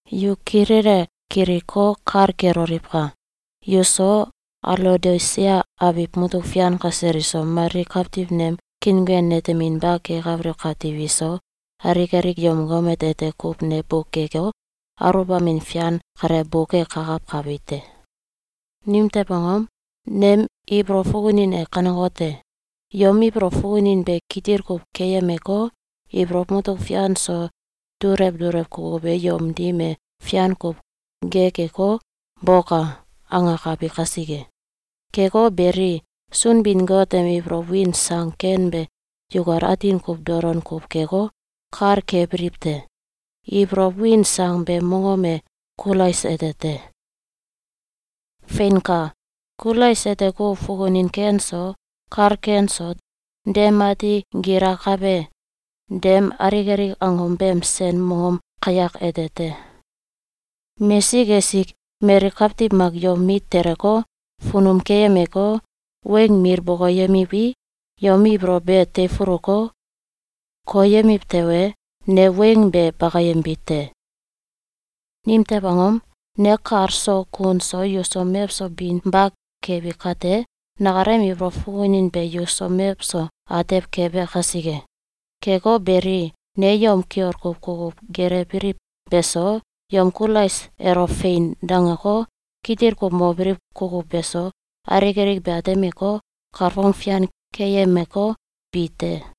Yu kilele kiliko, kal keloliwka! Yuso, Alaodisia abiw mutuk fian kasel iso, mali kawtiw nem kiinguen neteminba kekabiliw kawtiw iso, alik alik yom gomet ete kuw ne bukeko, aluwbamin fian kale bukekakawkabi te. Nimtew angom? Nem ibolow fukunin e kanekote: “Yom ibolow fukunin be kitil kuw keyemeko, ibolow mutuk fian so dulew dulew kukuw e yom dim e fian kuw gekeko, boka!”, angekabi kasike. Keko beli, Sunbin-Got em ibolow win sang ken be yukal atin kuw dolon kuw keko, kal kebiliw te. Ibolow win sang beem mongom e Kulais ete te. Feinka! Kulais ete kuw fukunin ken so, kal ken so, dem ati gilakabe dem alik alik angom beem sen mongom kayak ete te. Mesik esik mali kawtiw mak yom mit teleko, funum keyemeko, weng mil bokoyemiwi, yom ibolow be teifuluko, koyemiw tewe, ne weng be bakayembi te. Nimtew angom? Ne kal so kun so yuso mewso binba kebi kate, nakalem ibolow fukunin be yuso mewso atew kebe kasike. Keko beli, ne yom kiol kuw kukuw gelewbiliw beso, yom Kulais elo “Fein!”, dangeko, kitil kuw mobiliw kukuw beso, alik alik be atemeko, kalfong fian keyemeko, bi te.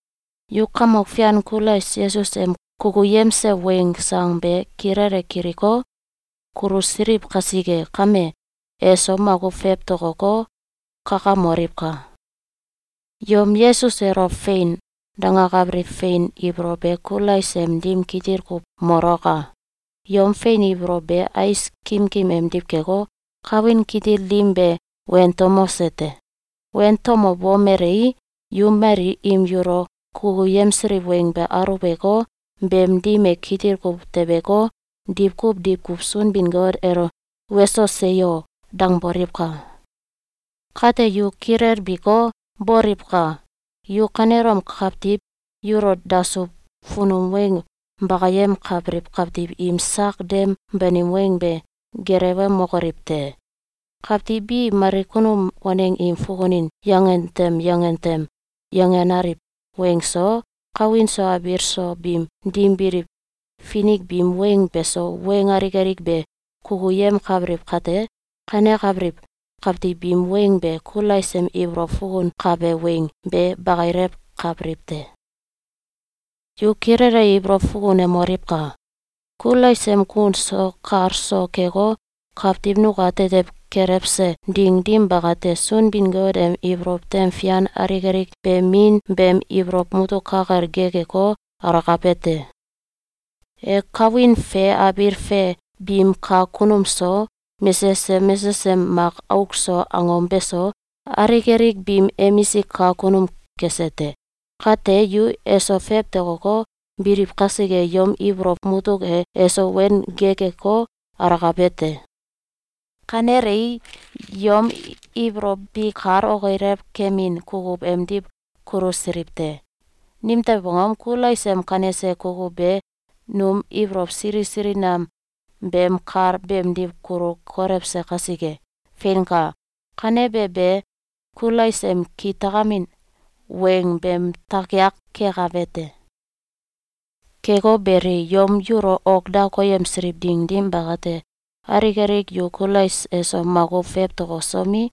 Yu Kamok Fian Kulais Yesus em kukuyemse weng sang be kilele kiliko, kulusiliw kasike kame, eso makuw fewtokoko, kakamoliwka! Yom Yesus elo “Fein!”, dangakabiliw fein ibolow be Kulais em dim kitil kuw molaka! Yom fein ibolow be ais kimkim emdiw keko, kawin kitil dim be wentomose te. Wentomobomelei, yu mali im yulo kukuyemsiliw weng be aluweko, beem dim e kitil kuw tebeko, diwkuw diwkuw Sunbin-Got elo “Weso! Seyo!”, dangboliwka! Kate yu kilelbiko, boliwka! Yu kanelom kawtiw yulo dasuw funum weng bakayemkabiliw kawtiw im sak dem banim weng be gelewemokoliw te! Kawtiw bi mali kunum waneng im fukunin yangen tem yangen tem yangenaliw weng so, kawin so abiil so biim dim biliw finik biim weng beso, weng alik alik be kukuyemkabiliw kate, kanekabiliw kawtiw biim weng be Kulais em ibolow fukunkabe weng be bakilewkabiliw te. Yu kilele ibolow fukunemoliwka! Kulais em kun so kal so keko, kawtiw nukatetew kelewse ding dim bakate, Sunbin-Got em ibolow tem fian alik alik be Min beem ibolow mutuk ka kel gekeko, alakabe te. E kawin fe abiil fe biim kak kunum so, mesesem mesesem mak auk so angom beso, alik alik biim emisik kak kunum kese te. Kate, yu eso fewtokoko, biliw kasike, yom ibolow mutuk e eso wen gekeko, alakabe te. Kanelei, yom ibolow bi kal okilew keemin kukuw emdiw kulusiliw te. Nimtew angom? Kulais em kanese kukuw be num ibolow sili sili nam beem kal beemdiw kulu kolewse kasike. Feinka! Kanebe be Kulais em kitakamin weng beem takiak kekabe te. Keko beli, yom yulo ok da koyemsiliw ding dim bakate, alik alik yu Kulais eso makuw fewtokosomi,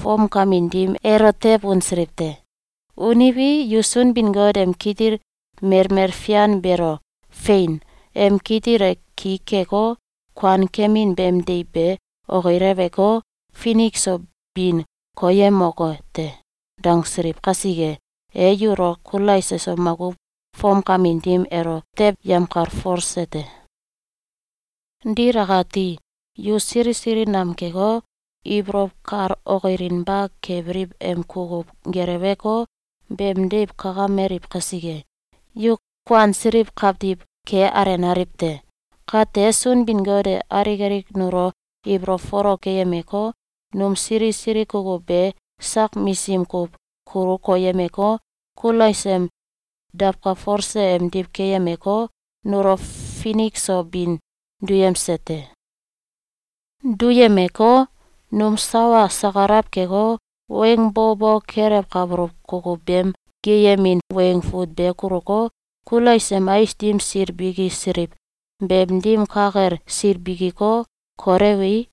fomkamin dim elo tew unsiliw te. Uniwi, yu Sunbin-Got em kitil melmel fian beelo “Fein! Em kitil e ki keko, kuankemin beem deiw be okileweko, finik so bin koyemoke te.”, dangsiliw kasike, e yulo Kulais eso makuw fomkamin dim elo tew yemkalfolse te. Dil akate, yu sili sili nam keko, ibolow kal okilinba kebiliw em kukuw geleweko, beem deiw kakameliw kasike, yu kuansiliw kawtiw ke alenaliw te. Kate, Sunbin-Got e alik alik nulo ibolow folok keyemeko, num sili sili kukuw be sak misism kuw kulu koyemeko, Kulais em dawkalfolse emdiw keyemeko, nulo finik so bin duyemse te. Duyemeko, num sawa sakalaw keko, weng bo bo kelewkabuluw kukuw beem geeyemin weng fut be kuluko, Kulais em ais dim sil bikisiliw beem dim ka kel sil bikiko, kolewei,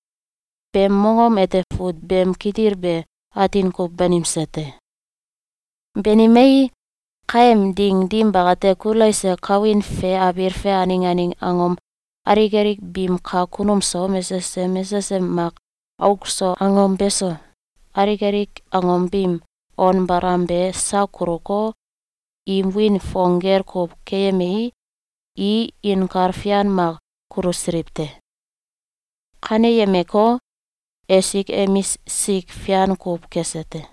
beem mongom ete fut beem kitil be atin kuw banimse te. Banimei, kaem ding dim bakate, Kulais e kawin fe abiil fe aneng aneng angom alik alik biim kak kunum so, mesesem mesesem mak auk so angom beso, alik alik angom biim on balam be sak kuluko, im wiin fong gel kuw keyemei, i inkal fian mak kulusiliw te. Kaneyemeko, esik emisik fian kuw kese te.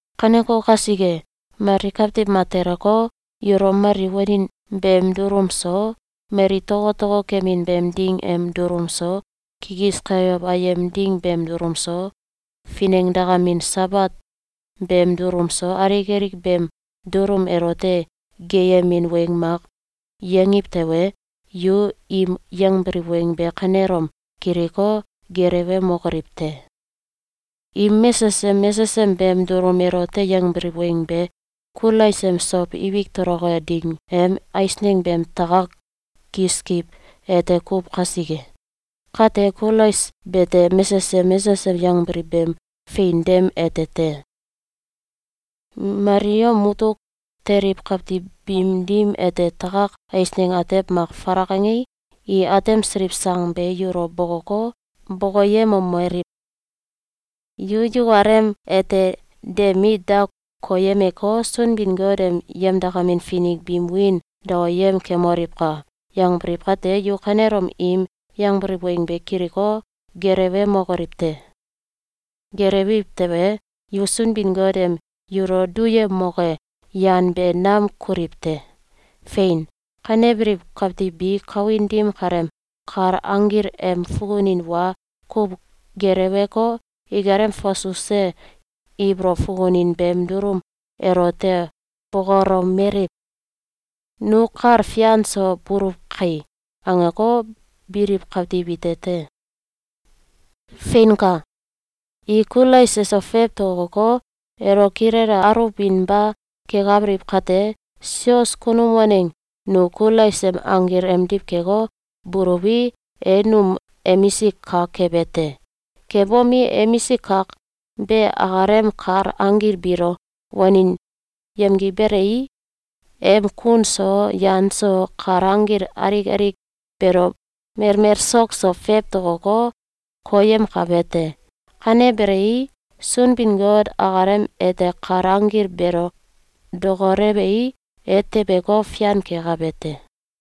Kaneko kasike, mali kawtiw mak teleko, yulo mali wanin beem dulum so, mali tokotoko kemin beem ding em dulum so, kikis kayow ayem ding beem dulum so, finengdakamin Sabat beem dulum so, alik alik beem dulum elote geeyemin weng mak yangiw tewe, yu im yangbiliw weng be kanelom kiliko, gelewemokoliw te! Im mesesem mesesem beem dulum elote yangbiliw weng be, Kulais em sow ibik toloke ding em eisneng beem takak kiskiw ete kuw kasike. Kate, Kulais bete mesesem mesesem yangbiliw beem fein dem ete te. Mali yom mutuk teliw kawtiw biim dim ete takak eisneng atew mak falak angei, i atemsiliw sang be yulo bokoko, bokoyemomeliw: “Yu yukalem ete de mit da koyemeko, Sunbin-Got em yemdakamin finik biim wiin daoyem kemoliwka!”, yangbiliw kate, yu kanelom im yangbiliw weng be kiliko, gelewemokoliw te! Gelewiw tewe, yu Sunbin-Got em yulo duyemoke yan be nam kuliw te. Fein! Kanebiliw kawtiw bi kawin dim kaleem kal anggil em fukunin wa kuw geleweko, ikalem fasuse ibolow fukunin beem dulum elote bokolomeliw: “Nu kal fian so buluw kai!”, angeko, biliw kawtiw ite te. Feinka! I Kulais eso fewtokoko, elo kilele aluwbinba kekabiliw kate, sios kunum waneng nu Kulais em anggil emdiw keko, buluwi, e num emisik kak kebe te. Kebomi, emisik kak be akalem kal anggil biilo wanin yemgiwbelei, em kun so, yan so, kal anggil alik alik beelo melmel sok so fewtokoko, koyemkabe te. Kanebelei, Sunbin-Got akalem ete kal anggil beelo dokolewei, e tebeko, fian kekabe te.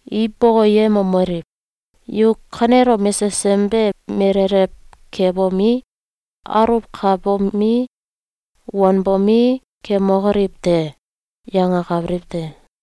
I bokoyemomeliw: “Yu kanelom mesesem be melelew kebomi, aluwkabomi, wanbomi, kemokoliw te!”, yangakabiliw te.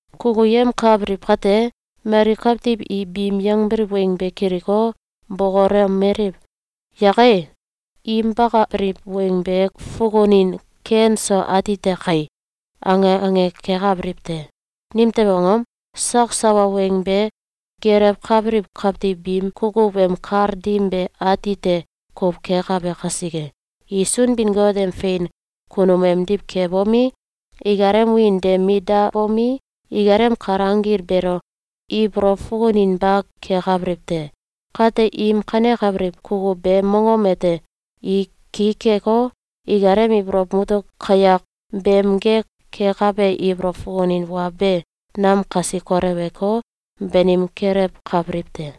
Kukuyemkabiliw kate, mali kawtiw i biim yangbiliw weng be kiliko, bokolomeliw: “Yake! Im bakabiliw weng be fukunin ken so atite kai!”, ange ange kekabiliw te. Nimtew angom? Sak sawa weng be gelewkabiliw kawtiw biim kukuw em kal dim be ati te kuw kekabe kasike. I Sunbin-Got em fein kunum emdiw kebomi, ikalem wiin de mit dabomi, ikalem kal anggil beelo ibolow fukuninba kekabiliw te. Kate, im kanekabiliw kukuw beem mongom ete i ki keko, ikalem ibolow mutuk kawyak beem gek kekabe ibolow fukunin wa be nam kasi koleweko, banim kelewkabiliw te.